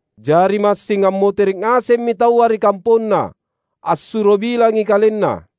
Jari massing ammotere’ ngasemmi taua ri kamponna, assuro bilangi kalenna.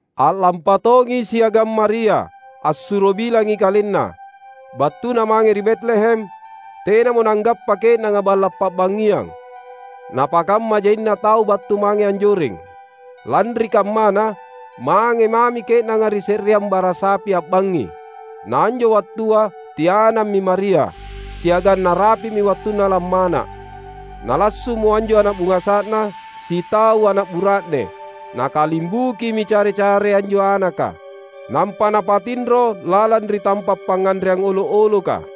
A’lampa tongi siagang Maria, assuro bilangi kalenna. Battuna mange ri Betlehem, tenamo nanggappa ke’nanga balla’ pa’bangngiang, napakamma jaina tau battu mange anjoreng. Lanri kammana, mange mami ke’nanga ri se’reang bara sapi a’bangngi. Na anjo wattua tianammi Maria, siagang narapi’mi wattunna lammana’. Nalassu’mo anjo ana’ bungasa’na, sitau ana’ bura’ne. Nakalimbukimi care-care anjo anaka, nampa napatinro lalang ri tampa’ pangnganreang olo’-oloka.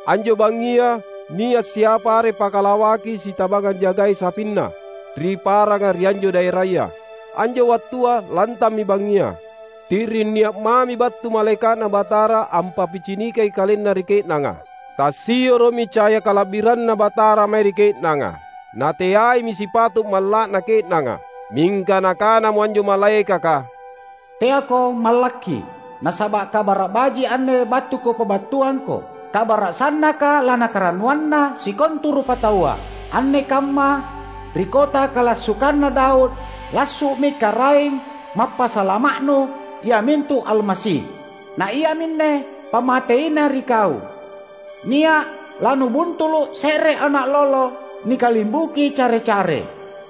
Anjo bangngia nia’ siapa are pakalawaki sitabang anjagai sapinna ri paranga ri anjo daeraya. Anjo wattua lantammi bangngia. Ti’ring nia’ mami battu malaeka’Na Batara ampappicinikangi kalenna ri ke’nanga; tassioro’mi caya kala’biranNa Batara mae ri ke’nanga. Na teaimi sipato’ malla’na ke’nanga. Mingka nakanamo anjo malaekaka, "Teako mallakki! Nasaba’ kabara’ baji’ anne battu kupabattuangko; kabara’ sannaka lanakarannuanna sikontu rupataua. Anne kamma, ri kota kalassukanna Daud, lassu’mi Karaeng Mappasalama’nu iamintu Almasi. Na iaminne pammateina ri kau: Nia’ lanubuntulu’ se’re ana’ lolo nikalimbuki care-care,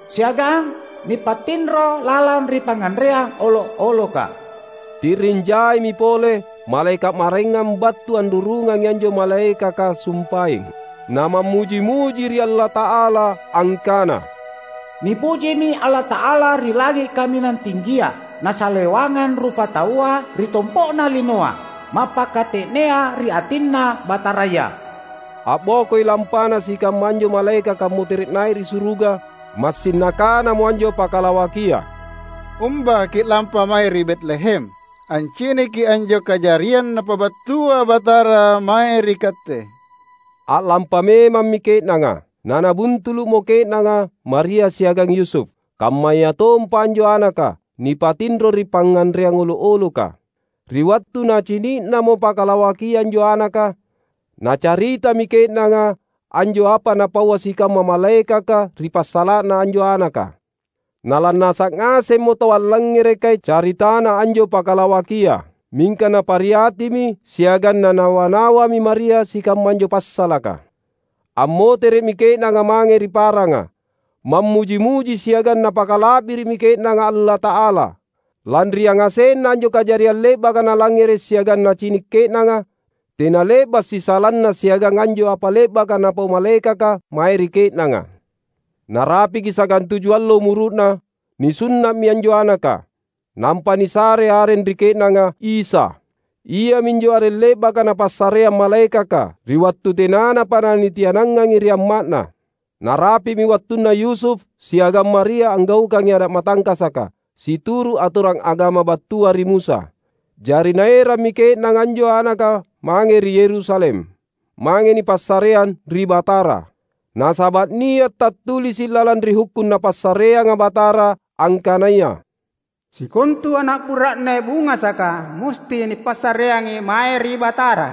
siagang nipatinro lalang ri pangnganreang olo’-oloka." Ti’ring jaimi pole malaeka’ maraengang battu anrurungangi anjo malaekaka sumpaeng, na mammuji-muji ri Allata’ala, angkana, "Nipujimi Allata’ala ri langi’ kaminang tinggia! Nasalewangang rupataua ri tompo’na linoa mappakate’nea ri atinNa Bataraya!" A’bokoi lampana sikamma anjo malaekaka ammotere’ nai’ ri suruga, massing nakanamo anjo pakalawakia, "Umba ki’lampa mange ri Betlehem anciniki anjo kajariang Napabattua Batara mae ri katte." A’lampa memammi ke’nanga. Na nabuntulu’mo ke’nanga Maria siagang Yusuf, kammayatompa anjo anaka, nipatinro ri pangnganreang olo’-oloka. Ri wattu nacini’namo pakalawakia anjo anaka, nacaritami ke’nanga anjo apa napaua sikamma malaekaka ri passala’na anjo anaka. Na lannasa’ ngasemmo tau allangngerekai caritana anjo pakalawakia. Mingka napariatimi siagang nanawa-nawami Maria sikamma anjo passalaka. Ammotere’mi ke’nanga mange ri paranga, mammuji-muji siagang napakala’biri’mi ke’nanga Allata’ala, lanri yangasenna anjo kajariang le’baka nalangngere’ siagang nacini’ ke’nanga, tena le’ba’ sisalana siagang anjo apa le’baka napau malaekaka mae ri ke’nanga. Narapiki sagantuju allo umuru’na, nisunna’mi anjo anaka. Nampa nisare areng ri ke’nanga Isa. Iaminjo areng le’baka napassareang malaekaka, ri wattu tenanapa na nitianangangi ri amma’Na. Narapi’mi wattunna Yusuf siagang Maria anggaukangi ada’ matangkasaka, situru’ atorang agama battua ri Musa. Jari naerammi ke’nanga anjo anaka mange ri Yerusalem, mange nipassareang ri Batara. Nasaba’ nia’ tattulisi’ lalang ri Hukkung Napassareanga Batara angkanaya, "Sikontu ana’ bura’ne bungasaka musti nipassareangi mae ri Batara."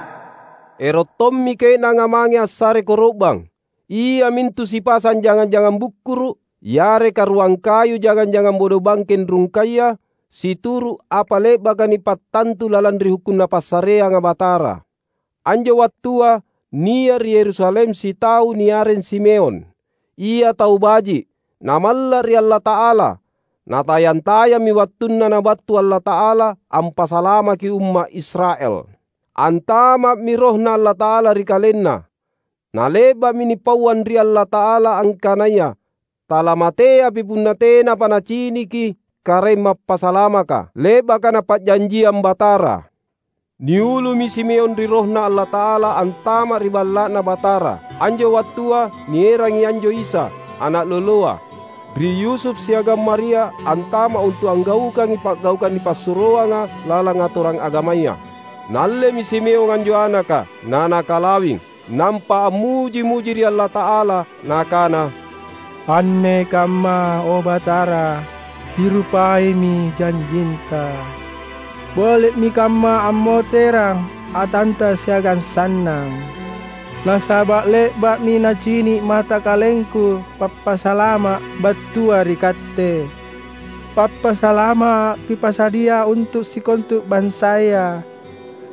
Ero’ tommi ke’nanga mange assare koro’bang, iamintu sipasang jangang-jangang bukkuru’, yareka ruang kayu jangang-jangang bodobangkeng rungkaya, situru’ apa le’baka nipattantu lalang ri Hukkung Napassareanga Batara. Anjo wattua nia’ ri Yerusalem sitau niareng Simeon. Ia tau baji’, na malla’ ri Allata’ala. Na tayang-tayammi wattunna nabattu Allata’ala ampasalamaki umma’ Israel. Antama’mi RohNa Allata’ala ri kalenna. Na le’ba’mi nipauang ri Allata’ala angkanaya talamateapi punna tenapa naciniki Karaeng Mappasalamaka, le’baka Napa’janjiang Batara. Niulumi Simeon ri RohNa Allata’ala antama’ ri Balla’Na Batara. Anjo wattua nierangi anjo Isa, ana’ loloa, ri Yusuf siagang Maria antama’ untu’ anggaukangi pa’gaukang nipassuroanga lalang atorang agamaya. Naallemi Simeon anjo anaka, na nakalawing, nampa ammuji-muji ri Allata’ala, nakana, "Anne kamma, o Batara, Kirupaimi janjinTa. Boli’mi kamma ammoterang atanTa siagang sannang. Nasaba’ le’ba’mi nacini’ mata kalengku Pappasalama’ battua ri Katte. Pappasalama’ Kipasadia untu’ sikontu bansaya: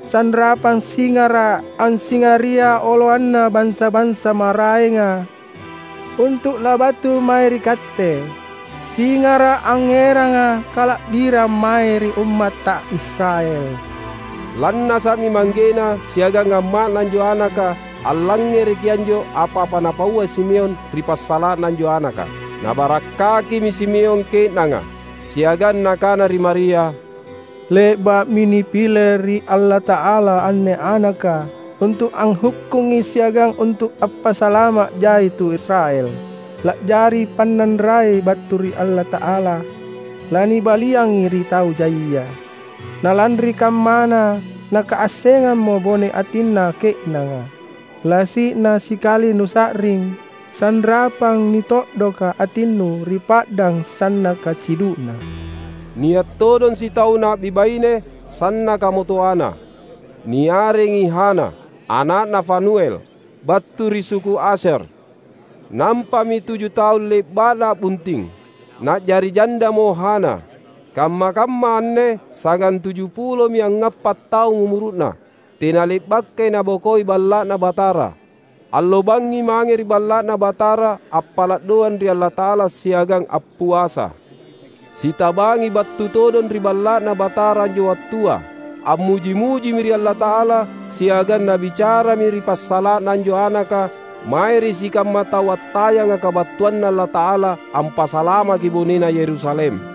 Sanrapang singara’, ansingaria oloanna bansa-bansa maraenga, untu’ labattu mae ri Katte; singara’ angngeranga kala’birang mae ri ummatTa Israel." Lannasa’mi manggena siagang amma’na anjo anaka allangngereki anjo apa-apa napaua Simeon ri passala’na anjo anaka. Nabarakkakimi Simeon ke’nanga; siagang nakana ri Maria, "Le’ba’mi nipile ri Allata’ala anne anaka untu’ anghukkungi siagang untu’ appasalama’ jai tu Israel. La’jari pannanrai battu ri Allata’ala, lanibaliangi ri tau jaia, na lanri kammana nakaassengammo bone atinna ke’nanga. Lasi’na sikali nusa’ring, sanrapang nito’doka atinnu ri pa’dang sannaka cidu’na." Nia’ todong sitau na’bi baine sannakamo toana. Niarengi Hana, ana’na Fanuel, battu ri suku Asyer. Nampami tuju taung le’ba’na a’bunting, na’jari jandamo Hana. Kamma-kamma anne sagantujupulomi angngapa’ taung umuru’na. Tena le’bakai nabokoi Balla’Na Batara. Allo bangngi mange ri Balla’Na Batara appala’ doang ri Allata’ala siagang appuasa. Sitabangi battu todong ri Balla’Na Batara anjo wattua. Ammuji-mujimi ri Allata’ala, siagang nabicarami ri passala’na anjo Anaka mae ri sikamma tau attayanga kabattuanNa Allata’ala ampasalamaki bonena Yerusalem.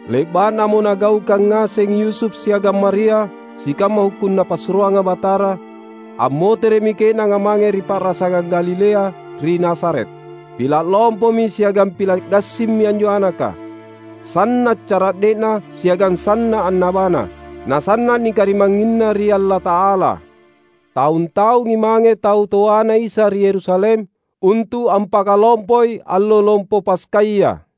Le’ba’namo nagaukang ngaseng Yusuf siagang Maria sikamma Hukkung Napassuroanga Batara, ammotere’mi ke’nanga mange ri pa’rasangang Galilea, ri Nazaret. Pila’ lompomi siagang pila’ gassimmi anjo anaka. Sanna’ cara’de’na siagang sanna’ annabana, na sanna’ nikarimangnginna ri Allata’ala. Taung-taungi mange tau toaNa Isa ri Yerusalem untu’ ampakalompoi allo Lompo Paskaya.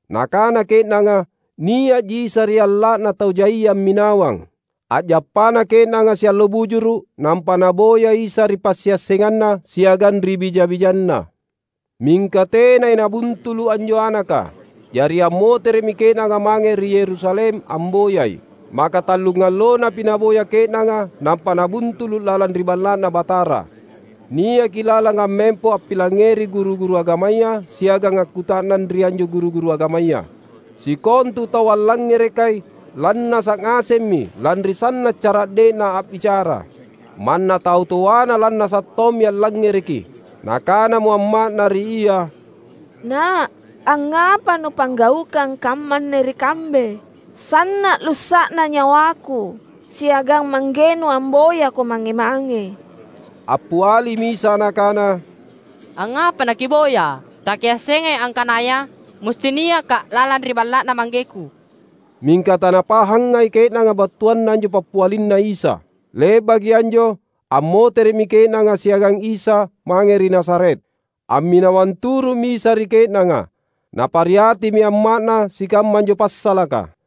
Nakana ke’nanga nia’ji Isa ri alla’na tau jaia amminawang. A’jappana ke’nanga siallo bujuru’ nampa naboya Isa ri passiassenganna siagang ri bija-bijanna. Mingka tenai nabuntulu’ anjo Anaka. Jari ammotere’mi ke’nanga mange ri Yerusalem amboyai. Makatallungallonapi naboya ke’nanga nampa nabuntulu’ lalang ri Balla’Na Batara. Niaki lalang ammempo ampilangngeri guru-guru agamaya siagang akkuta’nang ri anjo guru-guru agamaya. Sikontu tau allangngerekai lannasa’ ngasemmi lanri sanna’ cara’de’Na a’bicara. Manna tau toaNa lannasa’ tommi allangngereki. Nakanamo amma’Na ri Ia, "Na’, angngapa Nuppanggaukang kammanne ri kambe? Sanna’ lussa’na nyawaku siagang manggeNu amboyaKo mange-mange!" Appialimi Isa Nakana, "Angngapa nakiboyA’? Takiassengai angkanaya musti niakKa’ lalang ri Balla’Na ManggeKu?" Mingka tanapahangai ke’nanga battuanna anjo pappialinNa Isa. Le’baki anjo, ammotere’mi ke’nanga siagang Isa mange ri Nazaret. Amminawang turu’mi Isa ri ke’nanga. Napariatimi amma’Na sikamma anjo passalaka.